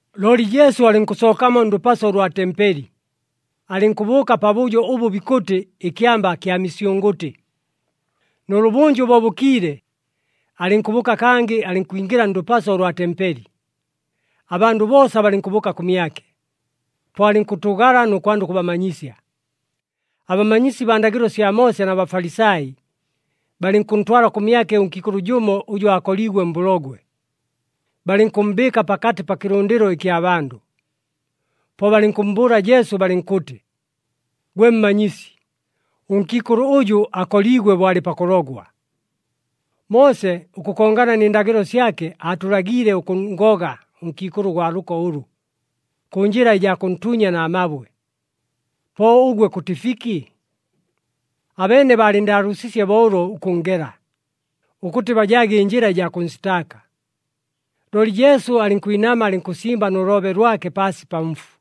Looli Jesu alɨnkʉsookamo ndʉpaso ʉlwa tempeli, alɨnkʉbʉʉka pabʉjo ʉbʉ bikʉtɨ ɨKyamba kya Misyʉngʉtɨ. Nʉlʉbʉnjʉ bo bʉkiile, alɨnkʉbʉʉka kangɨ alɨnkwingɨla ndʉpaso ʉlwa tempeli. Abandʉ boosa balɨnkʉbʉʉka kʉmyake, po alɨnkʉtʉʉgala nʉ kwanda ʉkʉbamanyisya. Abamanyisi baa ndagɨlo sya Moose na Bafalisai, balɨnkʉntwala kʉmyake ʉnkiikʉlʉ jʉmo ʉjʉ aakoliigwe mbʉlogwe, balɨnkʉmmbɨɨka pakatɨ pa kɨlʉndɨlo ɨkya bandʉ. Po balɨnkʉmmbʉʉla Jesu balɨnkʉtɨ, “Gwe Mmanyisi, ʉnkiikʉlʉ ʉjʉ akoliigwe bo alɨ pakʉlogwa. Moose, ʉkʉkongana nɨ ndagɨlo syake, aatʉlagiile ʉkʉnngoga ʉnkiikʉlʉ ʉgwa lʉko ʉlʉ, kʉ njɨla ɨjaa kʉntuunya na mabwe. Po ʉgwe kʉtɨ fiki?” Abeene baalɨnndaalʉʉsiisye bo ʉlo ʉkʉnngela, ʉkʉtɨ bajaage ɨnjɨla ɨjaa kʉnsitaaka. Looli Jesu alɨnkwinama alɨnkʉsimba nʉ loobe lwake paasi pa mfu.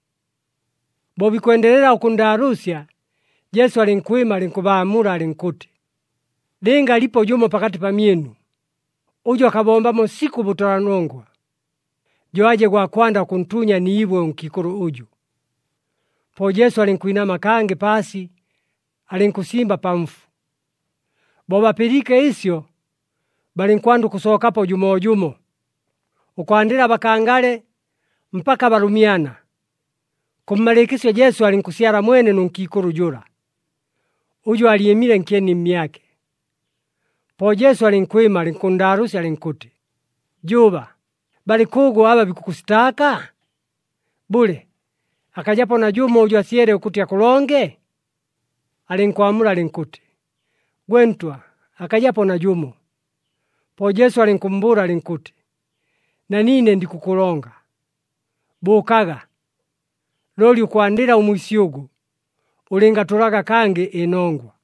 Bo bikwendelela ʉkʉnndaalʉʉsya, Jesu alɨnkwɨma alɨnkʉbaamula alɨnkʉtɨ, “Lɨnga alipo jʉmo pakatɨ pamyɨnu, ʉjʉ akabombamo sikʉ ʉbʉtʉlanongwa, jo aje gwa kwanda ʉkʉntuunya ni ibwe ʉnkiikʉlʉ ʉjʉ.” Po Jesu alɨnkwinama kangɨ paasi, alɨnkʉsimba pa mfu. Bo bapɨliike ɨsyo, balɨnkwanda ʉkʉsookapo jʉmoojʉmo, ʉkwandɨla abakangale mpaka abalʉmyana. Kʉmmalɨɨkɨsyo Jesu alɨnkʉsyala mwene nʉ nkiikʉlʉ jʉla, ʉjʉ aalyɨmile nkyeni mmyake. Po Jesu alɨnkwɨma, alɨnkʉnndaalʉʉsya alɨnkʉtɨ, “Jʉʉba, balɨ kʉʉgʉ aba bikʉkʉsitaaka? Bʉle, akajapo najʉmo ʉjʉ asyele ʉkʉtɨ akʉlonge?” Alɨnkwamula alɨnkʉtɨ, “Gwe Ntwa, akajapo najʉmo.” Po Jesu alɨnkʉmmbʉʉla alɨnkʉtɨ, “Na niine ndikʉkʉlonga. Bʉʉkaga, looli ʉkwandɨla ʉmwisyʉgʉ, ʉlɨngatʉlaga kangɨ ɨnongwa.”]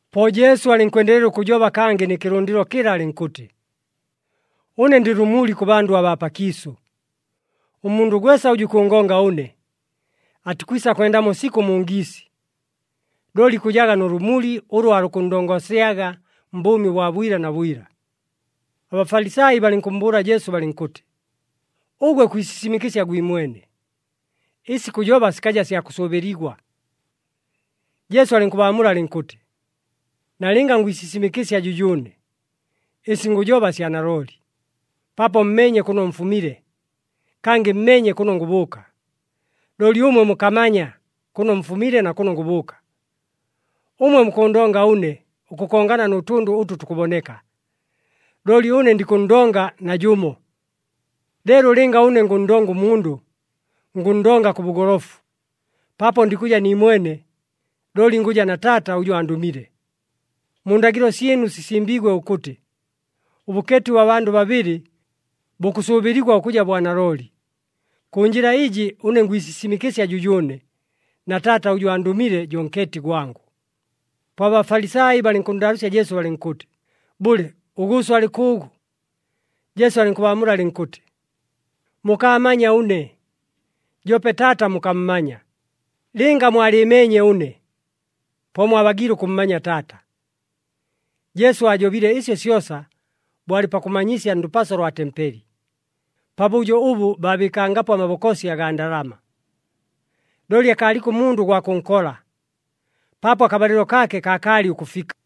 Po Jesu alɨnkwendelela ʉkʉjoba kangɨ nɨ kɨlʉndɨlo kɨla alɨnkʉtɨ, “Ʉne ndɨ lʉmuli kʉ bandʉ abaa pakiisʉ. Ʉmundʉ gwesa ʉjʉ ikʉngonga ʉne, atikwisa kwendamo sikʉ mu ngiisi, looli ikʉjaga nʉ lʉmuli ʉlʉ aalukʉnndongosyaga mbʉʉmi bwa bwila na bwila.” ABafalisai balɨnkʉmmbʉʉla Jesu balɨnkʉtɨ, “Ʉgwe kwisisimɨkɨsya gwimwene, ɨsi kʉjoba sikaja sya kʉsʉʉbɨligwa.” Jesu alɨnkʉbaamula alɨnkʉtɨ, “Nalɨnga ngwisisimɨkɨsya jʉjʉʉne, ɨsi ngʉjoba sya nalooli, paapo mmeenye kʉno mfumile, kangɨ mmeenye kʉno ngʉbʉʉka. Looli ʉmwe mukamanya kʉno mfumile na kʉno ngʉbʉʉka. Ʉmwe mukʉʉndonga ʉne ʉkʉkongana nʉ tʉndʉ ʉtʉ tukʉboneka, looli ʉne ndikʉnndonga najʉmo. Leelo lɨnga ʉne ngʉnndonga ʉmundʉ, ngʉnndonga kʉ bʉgolofu, paapo ndikʉja niimwene, looli ngʉja na Taata ʉjʉ andʉmile. Mu ndagɨlo syɨnu sisimbiigwe ʉkʉtɨ, ʉbʉkeeti ʉbwa bandʉ babɨlɨ, bukʉsʉʉbɨligwa ʉkʉja bwa nalooli. Kʉ njɨla ɨjɨ ʉne ngwisisimɨkɨsya jʉjʉʉne, na Taata ʉjʉ andʉmile jo nkeeti gwangʉ.” Po aBafalisai balɨnkʉnndaalʉʉsya Jesu balɨnkʉtɨ, “Bʉle, ʉGʉʉso alɨ kʉʉgʉ?” Jesu alɨnkʉbaamula alɨnkʉtɨ, “Mukaamanya ʉne, joope Taata mukammanya. Lɨnga mwalɨɨmeenye ʉne, po mwabagiile ʉkʉmmanya Taata.” Jesu aajobile ɨsyo syosa bo alɨ pakʉmanyisya ndʉpaso lwa tempeli, pabʉjo ʉbʉ baabɨɨkangapo amabokosi agaa ndalama. Looli akaaliko ʉmundʉ ʉgwa kʉnkola, paapo akabalɨlo kaake kaakaalɨ ʉkʉfika.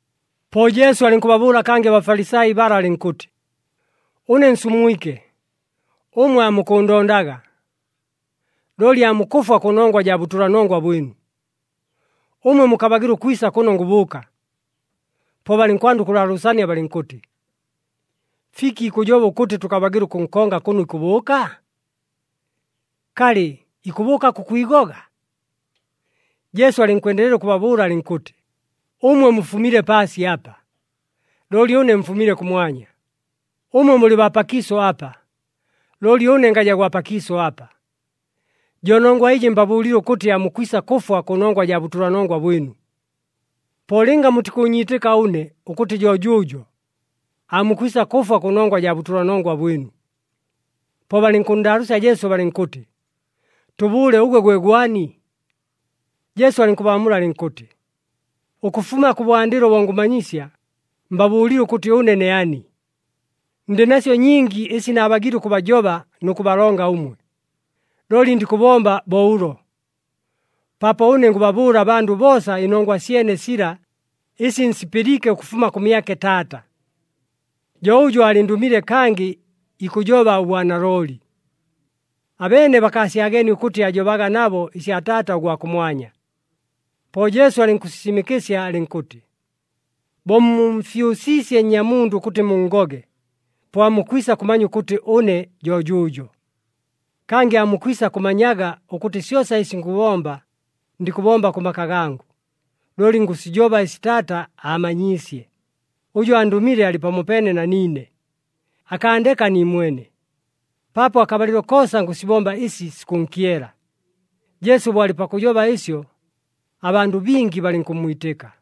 Po Jesu alɨnkʉbabʉʉla kangɨ aBafalisai bala alɨnkʉtɨ, “Ʉne nsumwike, ʉmwe aamukʉʉndondaga, looli aamukʉfwa kʉnongwa jaa bʉtʉlanongwa bwɨnu. Ʉmwe mukabagɨla ʉkwisa kʉno ngʉbʉʉka.” Po balɨnkwanda ʉkʉlaalʉʉsania balɨnkʉtɨ, “Fiki ikʉjoba ʉkʉtɨ tʉkabagɨla ʉkʉnkonga kʉno ikʉbʉʉka? Kalɨ, ikʉbʉʉka kʉkwigoga?” Jesu alɨnkwendelela ʉkʉbabʉʉla alɨnkʉtɨ, “Ʉmwe mufumile paasi apa, looli ʉne mfumile kʉmwanya. Ʉmwe mulɨ baa pakiisʉ apa, looli ʉne ngaja gwa pakiisʉ apa. Jo nongwa ɨjɨ mbabʉʉlile ʉkʉtɨ aamukwisa kʉfwa kʉnongwa jaa bʉtʉlanongwa bwɨnu. Po lɨnga mutikʉʉnyiitɨka ʉne ʉkʉtɨ jo jʉʉjo, aamukwisa kʉfwa kʉnongwa jaa bʉtʉlanongwa bwɨnu.” Po balɨnkʉnndaalʉʉsya Jesu balɨnkʉtɨ, “Tʉbʉʉle ʉgwe gwe gwani?” Jesu alɨnkʉbaamula alɨnkʉtɨ, “Ʉkʉfuma kʉbwandɨlo bo ngʉmanyisya, mbabʉʉlile ʉkʉtɨ ʉne ne ani. Ndɨ nasyo nyingi ɨsi naabagiile ʉkʉbajoba nʉ kʉbalonga ʉmwe, looli ndikʉbomba bo ʉlo. Paapo ʉne ngʉbabʉʉla abandʉ boosa ɨnongwa syene sila, ɨsi nsipɨliike ʉkʉfuma kʉmyake Taata. Jo ʉjʉ aalɨndʉmile kangɨ ikʉjoba ʉbwanalooli.” Abeene bakaasyageenie ʉkʉtɨ aajobaga nabo ɨsya Taata ʉgwa kʉmwanya. Po Jesu alɨnkʉsisimɨkɨsya alɨnkʉtɨ, “Bo mumfyʉsiisye Nnyamundʉ ʉkʉtɨ munngoge, po aamukwisa kʉmanya ʉkʉtɨ ʉne jo jʉʉjo. Kangɨ aamukwisa kʉmanyaga ʉkʉtɨ syosa ɨsi ngʉbomba, ndikʉbomba kʉ maka gangʉ, looli ngʉsijoba ɨsi Taata aamanyiisye. Ʉjʉ andʉmile alɨ pamopeene na niine. Akaandeka niimwene, paapo akabalɨlo koosa ngʉsibomba ɨsi sikʉnkyela.” Jesu bo alɨ pakʉjoba ɨsyo, abandʉ bingi balɨnkʉmmwitɨka.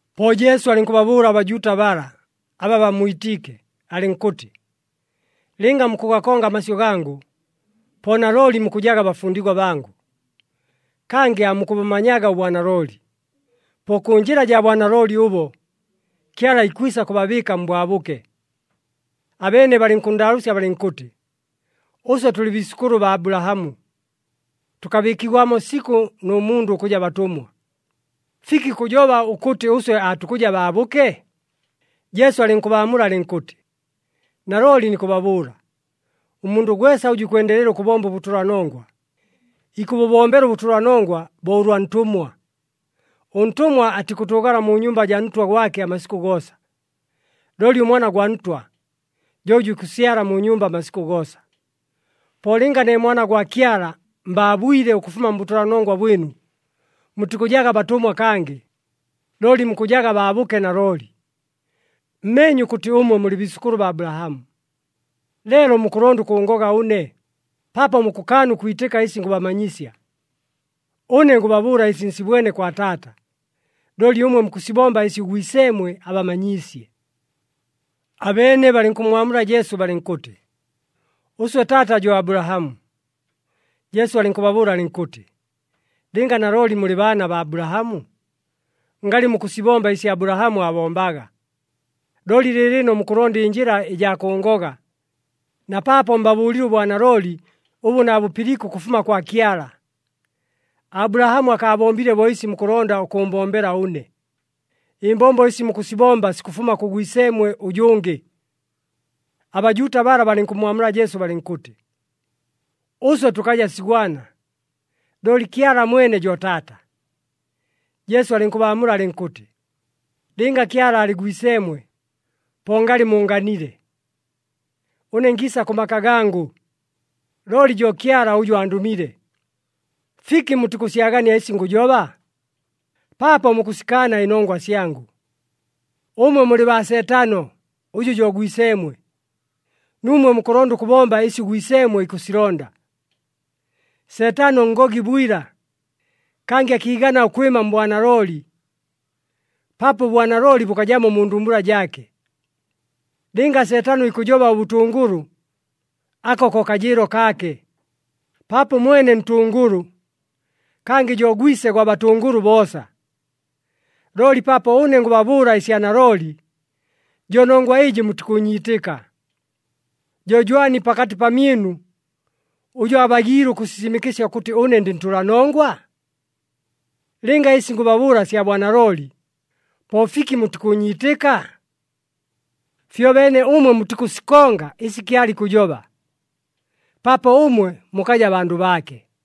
Po Jesu alɨnkʉbabʉʉla aBajuuta bala, aba bammwitiike, alɨnkʉtɨ, “Lɨnga mukʉgakonga amasyʉ gangʉ, po nalooli mukʉjaga bafundigwa bangʉ. Kangɨ aamukʉbʉmanyaga ʉbwanalooli. Po kʉ njɨla jaa bwanalooli ʉbo, Kyala ikwisa kʉbabɨɨka mbwabʉke.” Abeene balɨnkʉnndaalʉʉsya balɨnkʉtɨ, “Ʉswe tʉlɨ biisʉkʉlʉ baa Abulahamu. Tʉkabɨɨkigwamo sikʉ nʉ mundʉ ʉkʉja batʉmwa. Fiki kʉjoba ʉkʉtɨ ʉswe aatukʉja baabʉke?” Jesu alɨnkʉbaamula alɨnkʉtɨ, “Nalooli nikʉbabʉʉla, ʉmundʉ gwesa ʉjʉ ikwendelela ʉkʉbomba ʉbʉtʉlanongwa, ikʉbʉbombela ʉbʉtʉlanongwa bo ʉlwa ntʉmwa. Ʉntʉmwa atikʉtʉʉgala mu nyumba jaa ntwa gwake amasikʉ goosa, looli ʉmwana gwa ntwa, jo ʉjʉ ikʉsyala mu nyumba amasikʉ goosa. Po lɨnga ne Mwana gwa Kyala mbaabwile ʉkʉfuma mbʉtʉlanongwa bwɨnu, mutikʉjaga batʉmwa kangɨ, looli mukʉjaga baabʉke nalooli. Mmeenye ʉkʉtɨ ʉmwe mulɨ biisʉkʉlʉ baa Abulahamu, leelo mukʉlonda ʉkʉʉngoga ʉne, paapo mukʉkaana ʉkwitɨka ɨsi ngʉbamanyisya. Ʉne ngʉbabʉʉla ɨsi nsibwene kwa Taata, looli ʉmwe mukʉsibomba ɨsi ʉgwiseemwe abamanyiisye.” Abeene balɨnkʉmmwamula Jesu balɨnkʉtɨ, “Ʉswe taata jo Abulahamu.” Jesu alɨnkʉbabʉʉla alɨnkʉtɨ, “Lɨnga nalooli mulɨ baana baa Abulahamu, ngalɨ mukʉsibomba ɨsi Abulahamu aabombaga. Looli lɨɨlɨno mukʉlonda ɨnjɨla ɨjaa kʉʉngoga, na paapo mbabʉʉlile ʉbwanalooli ʉbʉ naabʉpɨliike ʉkʉfuma kwa Kyala. Abulahamu akaabombile bo ɨsi mukʉlonda ʉkʉʉmbombela ʉne. Ɨmbombo ɨsi mukʉsibomba sikʉfuma kʉ gwiseemwe ʉjʉngɨ.” ABajuuta bala balɨnkʉmmwamula Jesu balɨnkʉtɨ, “Ʉswe tʉkaja sigwana, looli Kyala mwene jo Taata.” Jesu alɨnkʉbaamula alɨnkʉtɨ, “Lɨnga Kyala aalɨ Gwiseemwe, po ngalɨ muunganile. Ʉne ngiisa kʉ maka gangʉ, looli jo Kyala ʉjʉ andʉmile. Fiki mutikʉsyagania ɨsi ngʉjoba? Paapo mukʉsikaana ɨnongwa syangʉ. Ʉmwe mulɨ baa Seetano ʉjʉ jo gwiseemwe, nuumwe mukʉlonda ʉkʉbomba ɨsi ʉgwiseemwe ikʉsilonda. Seetano ngogi bwila, kangɨ akiigana ʉkwɨma mbwanalooli, paapo ʉbwanalooli bʉkajamo mu ndumbula jaake. Lɨnga Seetano ikʉjoba ʉbʉtʉngʉlʉ ako ko kajɨɨlo kaake, paapo ʉmwene ntʉngʉlʉ kangɨ jo gwise gwa batʉngʉlʉ boosa. Looli paapo ʉne ngʉbabʉʉla ɨsya nalooli, jo nongwa ɨjɨ mutikʉʉnyiitɨka. “Jo jwani pakatɨ pamyɨnu ʉjʉ abagiile ʉkʉsisimɨkɨsya ʉkʉtɨ ʉne ndɨ ntʉlanongwa? Lɨnga ɨsi ngʉbabʉʉla sya bwanalooli, po fiki mutikʉʉnyiitɨka? Fyobeene ʉmwe mutikʉsikonga ɨsi Kyala ikʉjoba, paapo ʉmwe mukaja bandʉ baake.”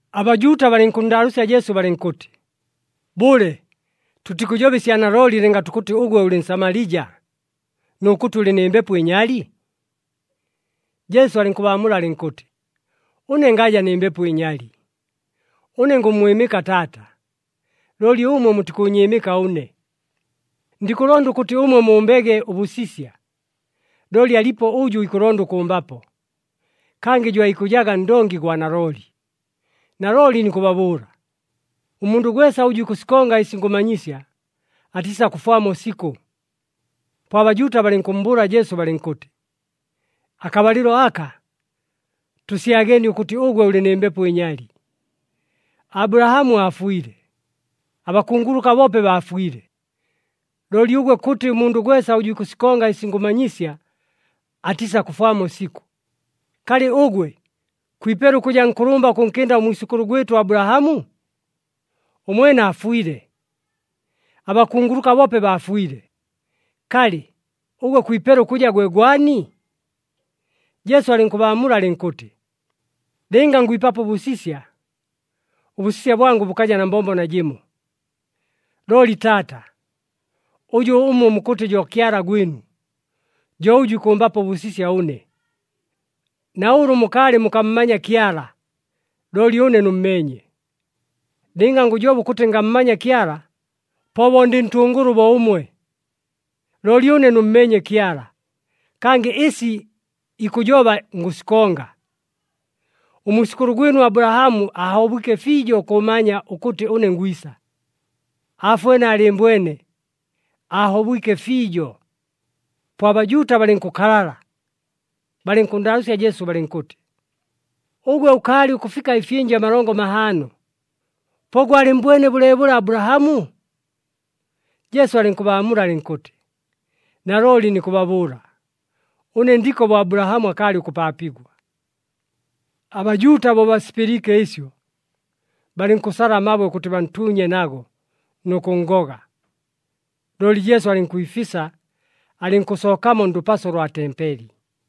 ABajuuta balɨnkʉnndaalʉʉsya Jesu balɨnkʉtɨ, “Bʉle, tʉtikʉjoba ɨsya nalooli lɨnga tukʉtɨ ʉgwe ʉlɨ Nsamalija nʉ kʉtɨ ʉlɨ nɨ mbepo ɨnyali?” Jesu alɨnkʉbaamula alɨnkʉtɨ, “Ʉne ngaja nɨ mbepo ɨnyali. Ʉne ngʉmmwɨmɨka Taata, looli ʉmwe mutikʉʉnyɨɨmɨka ʉne. Ndikʉlonda ʉkʉtɨ ʉmwe mumbege ʉbʉsisya, looli alipo ʉjʉ ikʉlonda ʉkʉmbapo, kangɨ jo aikʉjaga Ndongi gwa nalooli. Nalooli nikʉbabʉʉla, ʉmundʉ gwesa ʉjʉ ikʉsikonga ɨsi ngʉmanyisya, atiisakʉfwamo sikʉ.” Po aBajuuta balɨnkʉmmbʉʉla Jesu balɨnkʉtɨ, “Akabalɨlo aka tʉsyageenie ʉkʉtɨ ʉgwe ʉlɨ nɨ mbepo ɨnyali! Abulahamu aafwile. Abakunguluka boope baafwile. Looli ʉgwe kʉtɨ, ‘Ʉmundʉ gwesa ʉjʉ ikʉsikonga ɨsi ngʉmanyisya, atiisakʉfwamo sikʉ.’ Kalɨ ʉgwe, kwipela ʉkʉja nkʉlʉmba ʉkʉnkɨnda ʉmwisʉkʉlʉ gwɨtʉ Abulahamu? Ʉmwene aafwile. Abakunguluka boope baafwile. Kalɨ, ʉgwe kwipela ʉkʉja gwe gwani?” Jesu alɨnkʉbaamula alɨnkʉtɨ, “Lɨnga ngwipapo ʉbʉsisya, ʉbʉsisya bwangʉ bʉkaja na mbombo najɨmo. Looli Taata, ʉjʉ ʉmwe mukʉtɨ jo Kyala gwɨnu, jo ʉjʉ ikʉmbapo ʉbʉsisya ʉne. Na ʉlʉ mukaalɨ mukammanya Kyala, looli ʉne nʉmmeenye. Lɨnga ngʉjoba ʉkʉtɨ ngammanya Kyala, po bo ndɨ ntʉngʉlʉ bo ʉmwe. Looli ʉne nʉmmeenye Kyala, kangɨ ɨsi ikʉjoba ngʉsikonga. Ʉmwisʉkʉlʉ gwɨnu Abulahamu aahobwike fiijo ʉkʉmanya ʉkʉtɨ ʉne ngwisa. Aafwene aalɨɨmbwene, aahobwike fiijo.” Po aBajuuta balɨnkʉkalala, balɨnkʉnndaalʉʉsya Jesu balɨnkʉtɨ, “Ʉgwe ʉkaalɨ ʉkʉfika ɨfyɨnja amalongo mahaano, po gwalɨmmbwene bʉleebʉle Abulahamu?” Jesu alɨnkʉbaamula alɨnkʉtɨ, “Nalooli nikʉbabʉʉla, ʉne ndiko bo Abulahamu akaalɨ ʉkʉpaapigwa.” ABajuuta bo basipɨliike ɨsyo, balɨnkʉsala amabwe ʉkʉtɨ bantuunye nago nʉ kʉnngoga, looli Jesu alɨnkwifisa, alɨnkʉsookamo ndʉpaso lwa tempeli.